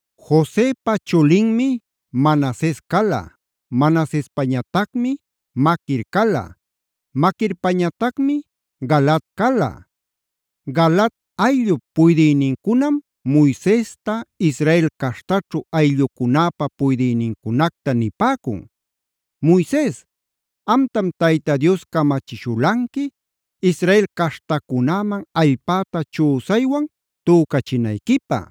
Josepa chulinmi Manases cala, Manasespañatacmi Maquir cala, Maquirpañatacmi Galaad cala. Galaad ayllup puydïnincunam Moisesta, Israel caśhtaćhu ayllucunäpa puydïnincunacta nipäcun: “Moises, amtam Tayta Dios camachishulanqui Israel caśhtacunäman allpäta chüsaywan tücachinayquipä.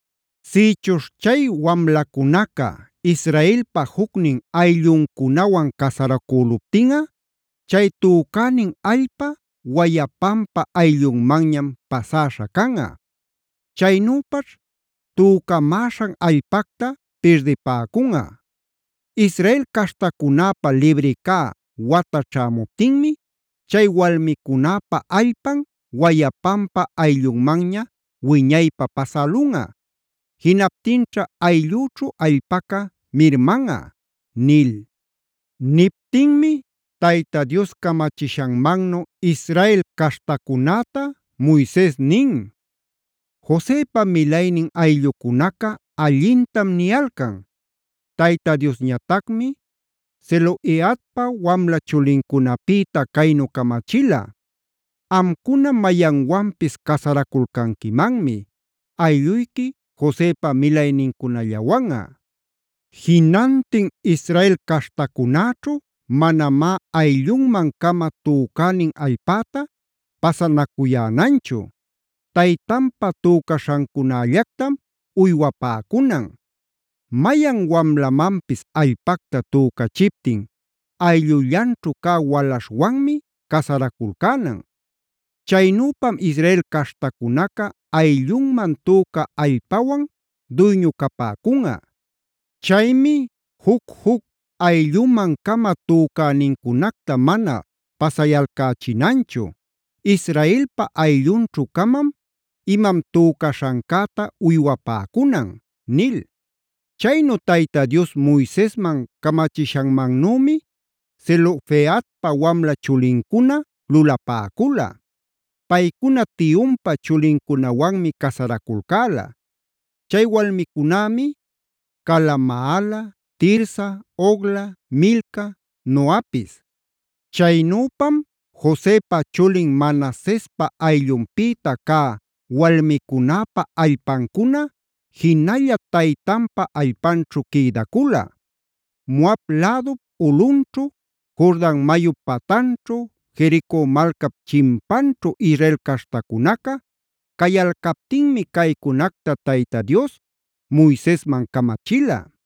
Sïchuśh chay wamlacunaca Israelpa jucnin aylluncunawan casaracüluptinꞌa chay tücänin allpa wayapanpa ayllunmanñam pasäśha canꞌa. Chaynüpaćh tücamäśhan allpacta pirdipäcüman. Israel caśhtacunäpä libri cä wata ćhämuptinmi chay walmicunäpä allpan wayapanpä ayllunmanña wiñaypä pasälunꞌa. Jinaptinćha ayllüćhu allpaca mirmanꞌa” nil. Niptinmi Tayta Dios camachishanmannu Israel caśhtacunäta Moises nin: “Josepa milaynin ayllucunaca allintam niyalcan. Tayta Diosñatacmi Zelofehadpa wamla chulincunapïta caynu camachila: ‘Amcuna mayanwanpis casaraculcanquimanmi, aylluyqui Josepa milaynincunallawanꞌa. Jinantin Israel caśhtacunäćhu manamá ayllunman-cama tücänin allpäta pasanacuyänanchu. Taytanpa tücaśhancunällactam uywapäcunan. Mayan wamlamanpis allpacta tücachiptin ayllullanćhu cä walaśhwanmi casaraculcänan. Chaynüpam Israel caśhtacunaca ayllunman tücä allpawan duyñu capäcunꞌa. Chaymi juc-juc aylluman-cama tücänincunacta mana pasayalcächinanchu. Israelpa ayllunćhu-camam imam tücaśhancäta uywapäcunan’” nil. Chaynu Tayta Dios Moisesman camachishanmannümi Zelofehadpa wamla chulincuna lulapäcula. Paycuna tiyunpa chulincunawanmi casaraculcäla. Chay walmicunämi cala: Maala, Tirsa, Hogla, Milca, Noapis. Chaynüpam Josepa chulin Manasespa ayllunpïta cä walmicunäpä allpancuna jinalla taytanpa allpanćhu quïdacula. Moab lädup ulꞌunćhu, Jordan mayup patanćhu, Jerico malcap chimpanćhu Israel caśhtacunaca cayalcaptinmi caycunacta Tayta Dios Moisesman camachila.